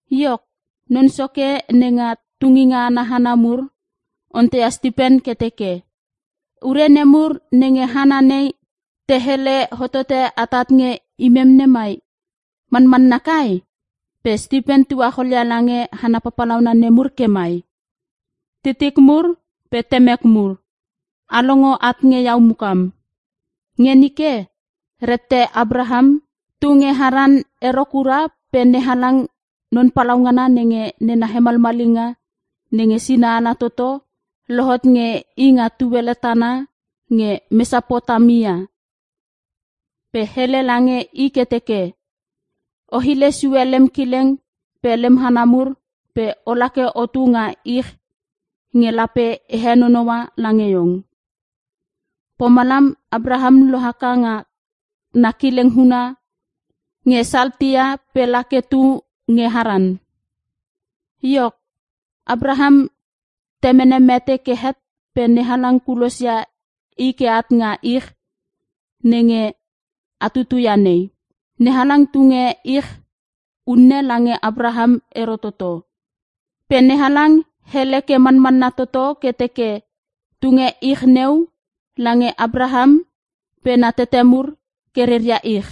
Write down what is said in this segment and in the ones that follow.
Iok, non soke nenga tunginga ana hana mur, onteia Stipen ke teke, “Ure nemur nenge hana nei te hele hotote atat nge imem nemai, manmanna kai?” Pe Stipen tuacholia lange hana papalauna nemur ke mai, “Titik mur pe temek mur, a longo at nge iau mukam! Nge nike, rette Apraham tu nge Haran ero kura pe NeHalang Non Palaungana nenge nena hemalmalinga nenge sina ala toto, lohot nge i nga tuele tana nge Mesapotamia. Pe hele lange i ke teke, ‘O hile sue lem kileng pe lem hana mur pe ola ke otu nga ich nge lape e henonoua lange iong.’ “Pomalam Apraham lohaka nga na kileng huna nge Saltea pe la ke tu nge Haran. Iok, Apraham temene mete ke het pe NeHalang kulosia i ke at nga ich nenge a tutuia nei. NeHalang tunge ich unne lange Apraham ero toto. Pe NeHalang hele ke manmanna toto ke teke tunge ich neu lange Apraham pe na tete mur ke rea ich.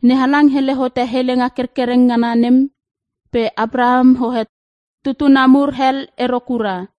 NeHalang hele hote helenga kerkereng ngana nem pe Apraham hoe tutuna mur hel ero kura.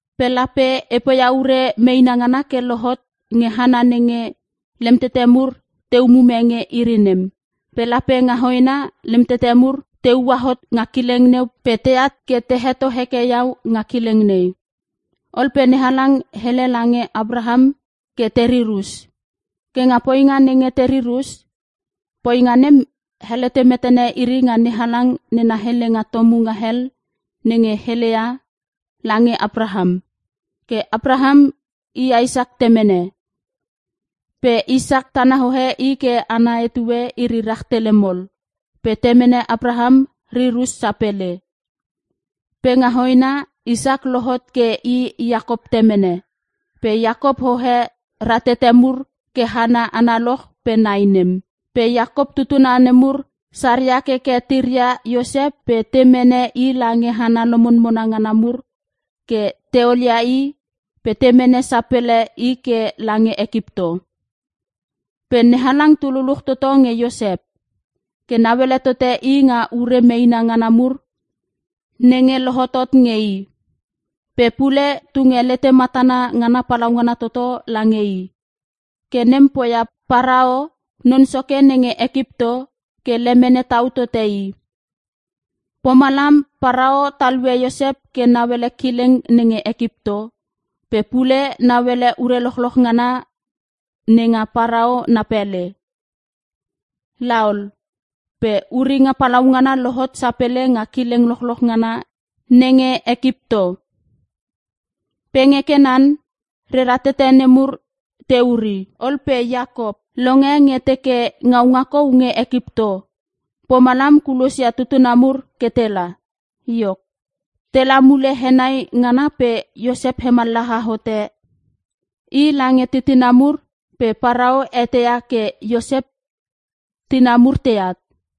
Pe lape e poia ure meena ngana ke lohot nge hana nenge lemtete mur te umume nge iri nem. Pe lape nga hoena lem tete mur te ua hot nga kileng neu pe teat ke te heto heke iau nga kileng nei.’ Ol pe NeHalang hele lange Apraham ke terir us. Ke nga poinga nenge terir us, poinga nem helete metene iri nga NeHalang nena helenga tomunga hel nenge heleia lange Apraham. Ke Apraham i Isak temene. Pe Isak, tana hoe i ke ana etue iri rahtele mol, pe temene Apraham rir us sapele. Pe nga hoena Isak lohot ke i Iakop temene. Pe Iakop hoe ra tete mur ke hana analoch pe nai nem. “Pe Iakop tutuna nemur saria keke tiria Iosep pe te mene i lange hana lomonmona ngana mur ke te olia i pe te mene sapele i ke lange Ekipto. Pe NeHalang tu luluch toto nge Iosep. Ke nauele tote i nga ure meena ngana mur nenge lohotot nge i. Pe pule tunge letematana ngana palaungana toto lange i. Ke nem poia Parao, non soke nenge Ekipto, ke lemene tau tote i. Pomalam Parao talue Iosep ke nauele kileng nenge Ekipto, pe pule nauele ure lochloch ngana nenga Parao na pele. “Laol pe uringa palaungana lohot sapele nga kileng lochloch ngana nenge Ekipto. Pe nge Kanan, rera tete nemur te uri. Ol pe Iakop longe nge te teke ngaunga kou nge Ekipto. Pomalam kulosia tutuna mur ke tela. Iok, tela mule henai ngana pe Iosep hemallaha hote i lange titina mur pe Parao eteia ke Iosep titina mur teat.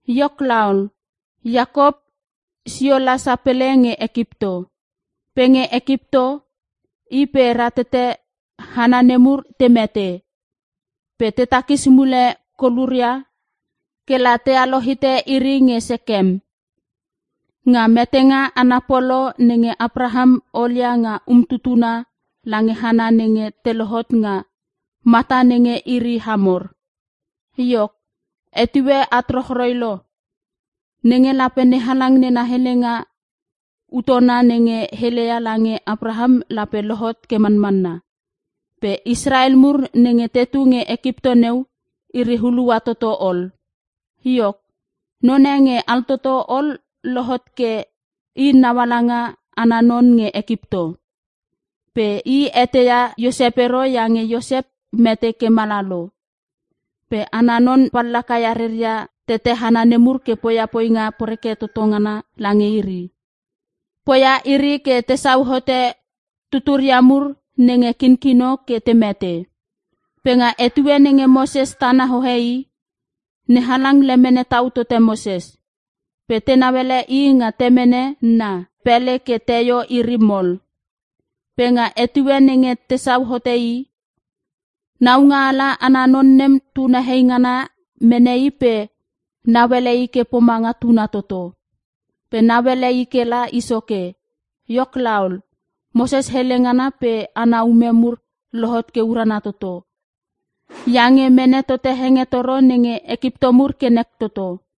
Iok laol, Iakop sio la sapele nge Ekipto. Pe nge Ekipto i pe ra tete hana nemur te mete. Pe te takis mule koluria kela tealo hite iri nge Sekem, nga metenga ana polo nenge Apraham olia nga umtutuna lange hana nenge te lohot nga mata nenge iri Hamor. “Iok, etue at rochroi lo, nenge lape NeHalang nena helenga utona nenge heleia lange Apraham lape lohot ke manmanna. Pe Israel mur nenge tetu nge Ekipto neu iri hulua toto ol. Iok, none nge altoto ol lohot ke i naungaala ana non nge Ekipto. Pe i eteia Iosep ero iange Iosep mete ke mala lo. Pe ana non pallakaia rera tete hana nemur ke poia poinga poreke toto ngana lange iri. Poia iri ke tesau hote tuturia mur nenge kinkino ke te mete. “Pe nga etue nenge Moses tana hoe i, NeHalang lemene tau tote Moses. Pe tenau ele i nga temene na pele ke teio iri mol. Pe nga etue nenge tesau hote i, naungaala ana non nem tuna hei ngana mene i pe nauele i ke pomanga tuna toto. Pe nauele i kela i soke. Iok laol, Moses hele ngana pe ana ume mur lohot ke urana toto, iange mene tote hengetoro nenge Ekipto mur ke nek toto.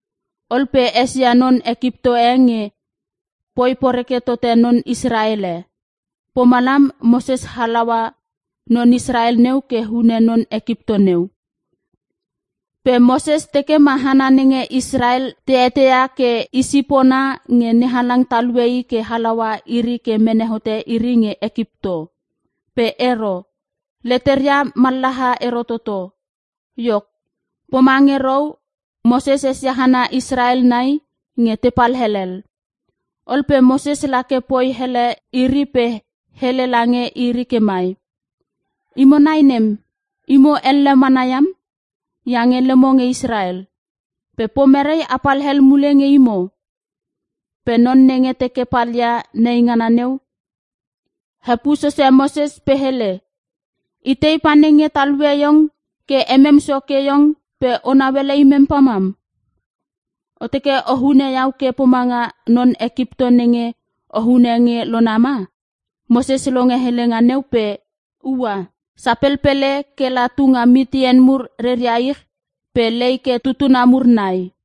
Ol pe esia non Ekipto e nge poi poreke tote non Israel e. Pomalam Moses halaua non Israel neu ke hune non Ekipto neu. Pe Moses teke ma hana nenge Israel te eteia ke, i sipona nge NeHalang talue i ke halaua iri ke mene hote iri nge Ekipto. Pe ero! Leteria mallaha ero toto! Iok poma ngerou, Moses esia hana Israel nai nge tepal helel. Ol pe Moses lake poi hele iri pe hele lange iri ke mai, ‘Imo nai nem! Imo elle mana iam, iange lemo nge Israel. Pe pomere apal hel mule nge imo?’ “Pe non nenge teke palia neingana neu hepuo sose Moses pe hele, ‘Itei panenge talue iong ke emem soke iong pe o nauele imem pamam? O teke o hune iau ke pomanga non Ekipto nenge o hune nge lona ma?’ Moses longe helenga neu pe ua sapelpele kela tu nga Mitian mur reria ich pe lei ke tutuna mur nai.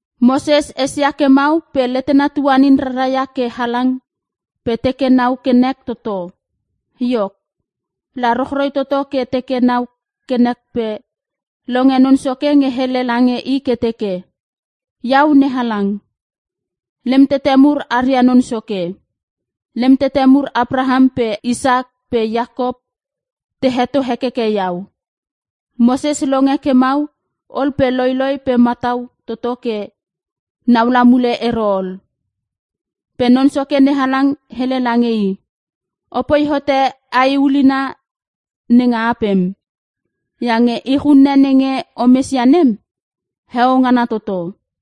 Moses esia ke mau pe letena tuanin rara ia ke halang pe teke nau ke nek toto. Iok, la rochroi toto ke teke nau ke nek pe longe Non Soke nge hele lange i ke teke, ‘Iau NeHalang, lem tete mur aria Non Soke. Lem tete mur Apraham pe Isak pe Iakop, te heto hekeke iau.’ Moses longe ke mau ol pe loiloi pe matau toto ke naula mule ero ol. “Pe Non Soke NeHalang hele lange i, ‘Opoi hote ae ulina nenga apem, iange ich unne nenge o mesia nem, heo ngana toto.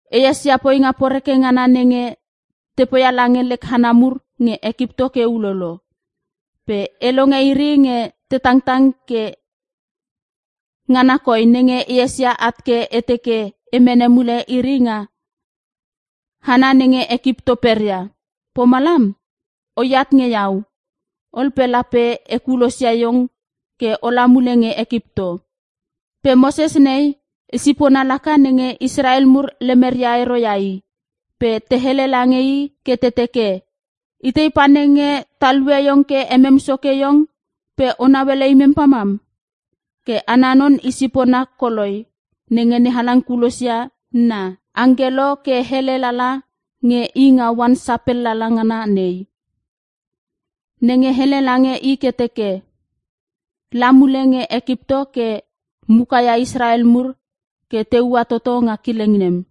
E esia poinga poreke ngana nenge te poia lange lek hana mur nge Ekipto ke ulolo. Pe e longe iri nge te tangtang ke ngana koi nenge esio at ke e teke e mene mule iri nga hana nenge Ekipto peria. Pomalam, oat nge iau ol pe lape e kulosia iong ke ola mule nge Ekipto.’ “Pe Moses nei, i sipona laka nenge Israel mur lemeria ero ia i, pe te hele lange i ke te teke, ‘Itei panenge talue iong ke emem Soke iong pe o nauele imem pamam?’ Ke ana non i sipona koloi nenge NeHalang kulosia na angkelo ke hele lala nge i nga oan sapelala ngana nei. Nenge hele lange i ke teke, la mule nge Ekipto ke mukaia Israel mur ke te ua toto nga kileng nem.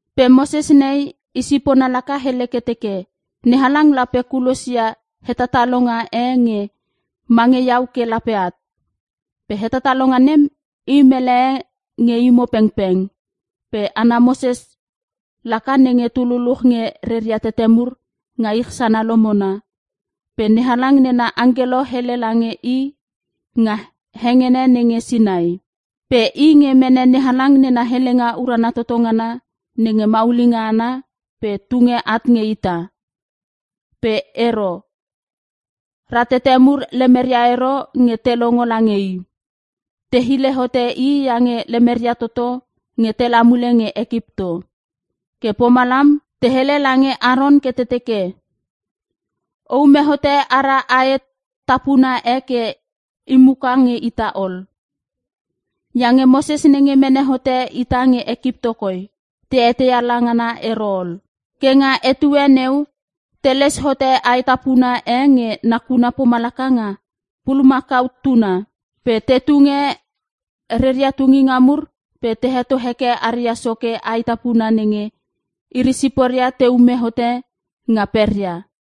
“Pe Moses nei, i sipona laka hele ke teke, ‘NeHalang lape kulosia hetatalonga e nge mange iau ke lape at. Pe hetatalonga nem, i mele e nge imo pengpeng.’ Pe ana Moses laka nenge tu luluch nge rera tete mur nga ich sana lomona, pe NeHalang nena angkelo hele lala nge i, nga hengene nenge Sinai. Pe i nge mene NeHalang nena helenga urana toto ngana nenge maulinga ana pe tunge at nge ita. “Pe ero! Ratete mur lemeria ero nge te longo lange i. Te hile hote i iange lemeria toto nge tela mule nge Ekipto. Ke pomalam te hele lange Aron ke te teke, ‘O ume hote ara ae tapuna e ke imuka nge ita ol. Iange Moses nenge mene hote ita nge Ekipto koi, ta eteia la ngana ero ol!’ Ke nga etue neu, te les hote ae tapuna e nge nakuna pomalaka nga pulumakau tuna. Pe te tunge reria tunginga mur pe te heto hekeke aria soke ae tapuna nenge iri siporia te ume hote nga peria.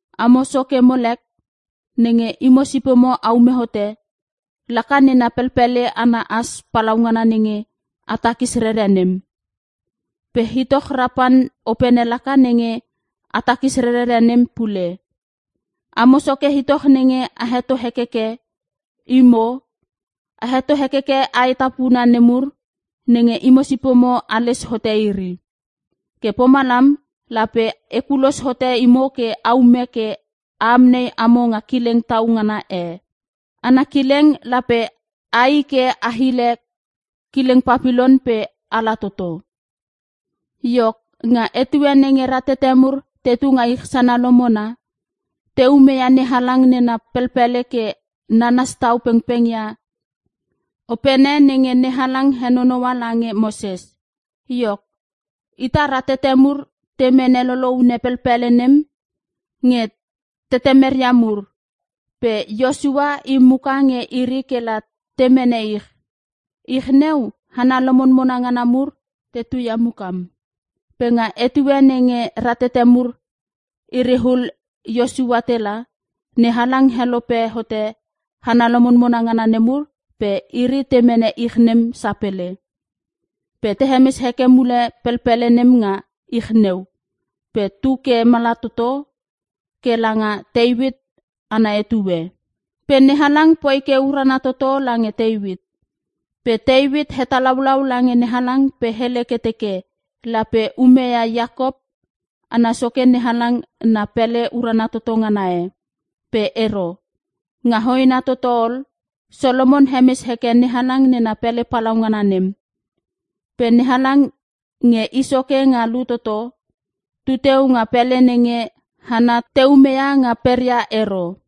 Amo soke Molek, nenge imo sipomo aume hote, laka nena pelpele ana as palaungana nenge a takis rerere nem. Pe itoch Repan opene laka nenge a takis rerere nem pule, amo soke itoch nenge a heto hekeke. Imo, a heto hekeke ae tapuna nemur nenge imo sipomo ales hote iri. Ke pomalam, lape e kulos hote imo ke a ume ke a amnei amo nga kileng tau ngana e. Ana kileng, lape ai ke a hile kileng Papilon pe ala toto.’ “Iok, nga etue nenge ratete mur tetu nga ich sana lomona, te umeia NeHalang nena pelpele ke nanas tau pengpeng ia opene nenge NeHalang henonoua lange Moses. Iok, ita ratete mur te mene loloune pelpele nem nge tetemeria mur, pe Iosua i muka nge iri kela te mene ich. Ich neu, hana lomonmona ngana mur te tuia mukam. Pe nga etue nenge ratete mur iriul Iosua tela, NeHalang helope hote hana lomonmona ngana nemur pe iri te mene ich nem sapele. Pe te hemes heke mule pelpele nem nga ich neu, pe tu ke mala toto ke langa Teuit ana etue. Pe NeHalang poi ke urana toto lange Teuit. Pe Teuit hetalaulau lange NeHalang pe hele ke teke lape umeia Iakop ana soke NeHalang na pele urana toto ngana e. Pe ero. Nga hoena toto ol, Solomon hemes heke NeHalang nena pele palaungana nem. “Pe NeHalang Nge I Soke Nga Lut Toto, tu teu nga pele nenge hana te umeia nga peria ero.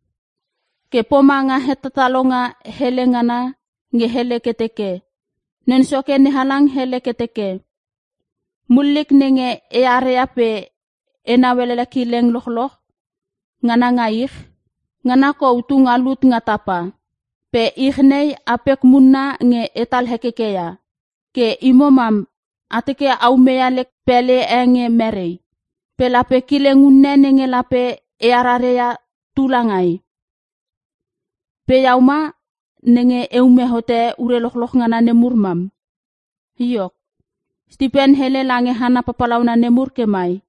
Ke pomanga hetatalonga hele ngana nge hele ke teke, “‘Non Soke NeHalang hele ke teke, Mullik nenge eare pe enau ele kileng lochloch ngana nga ich, ngana kou tu nga lut nga tapa. Pe ich nei apek munna nge etal hekeke ia. Ke imo mam a teke a umeia lek pele e nge mere? Pe lape kileng unne nenge lape e arare ia, tu langai? Pe iau ma nenge e ume hote ure lochloch ngana nemur mam.’” Iok, Stipen hele lange hana papalauna nemur ke mai,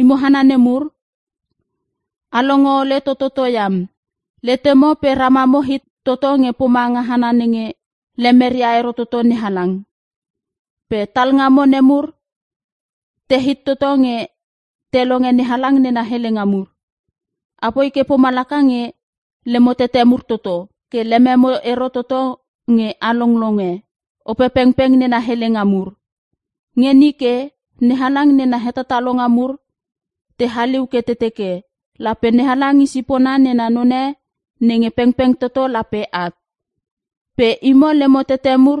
“Imo hana nemur, a longo ole tototo iam! Letemo pe ramamo hit toto ke pomange hana nenge lemeria ero toto NeHalang. Pe talngamo nemur, tehit toto nge te longe NeHalang nena helenga mur! Apoi ke pomalaka nge lemo tete mur toto, ke lememo ero toto nge a longlonge Opepengpeng nena helenga mur. Nge nike, NeHalang nena hetatalonga mur te haliu ke te teke, lape NeHalang i sipona nena none nge pengpeng toto lape at. Pe imo lemo tete mur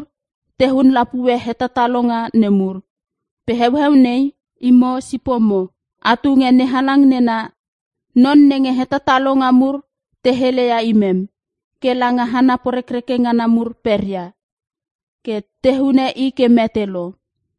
te hun lapue hetatalonga nemur. Pe heueu nei, imo sipona a tunge NeHalang nena non nenge hetatalonga mur te helele ia nem, ke langa hana porekreke ngana mur peria, ke te hune i ke mete lo.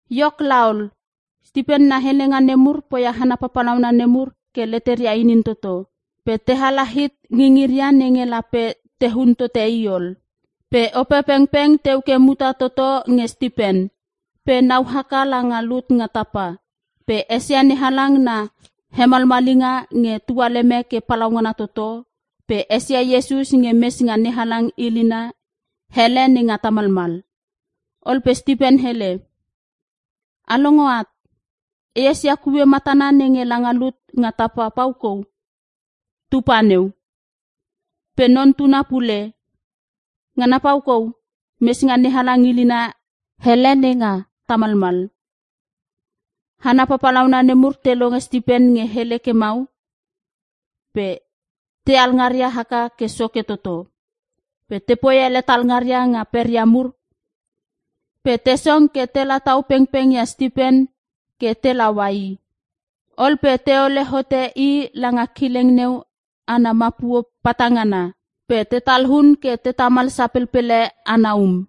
Iok laol, Stipen na helenga nemur poia hana papalauna nemur ke leteria inin toto, pe te hala hit ngingiria nenge lape te hun tote i ol. Pe Opepengpeng teu ke muta toto nge Stipen, pe nau haka langa lut nga tapa, pe esia NeHalang na hemalmalinga nge tualeme ke palaungana toto, pe esia Iesus nge mes nga NeHalang ilina ele nenge tamalmal. Ol pe Stipen hele, “A longo at, e esia kue matana nenge langa lut nga tapa pau kou tu pa neu. Pe Non Tuna pule, ngana pau kou mes nga NeHalang ilina ele nenge tamalmal.” Hana papalauna nemur te longe Stipen nge hele ke mau, pe te alngaria haka ke soke toto. Pe tepoi ele talngaria nga peria mur pe te song ke te latau pengpengia Stipen ke te laua i. Ol pe teole hote i langa kileng neu ana mapuo patangana, pe te talun ke te tamal sapelpele ana um.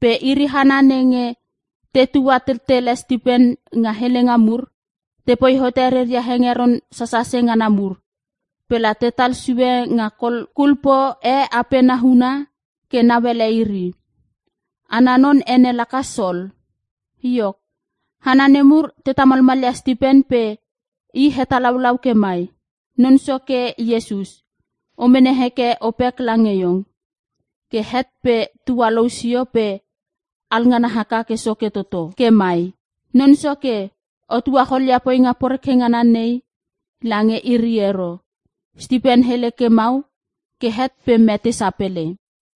Pe iri hana nenge tetua tettele Stipen nga helenga mur, tepoi hote reria hengeron sasase ngana mur, pela tetal sue nga kol kulpo e apena huna ke nauele iri. Ana non ene laka Sol. Iok, hana nemur te tamalmalia Stipen pe i hetalaulau ke mai, “Non Soke Iesus, o mene heke opek lange iong.” Ke het pe tualou sio pe alngana haka ke soke toto ke mai, “Non Soke o tuacholia poinga poreke ngana nei lange iri ero!” Stipen hele ke mau ke het pe mete sapele.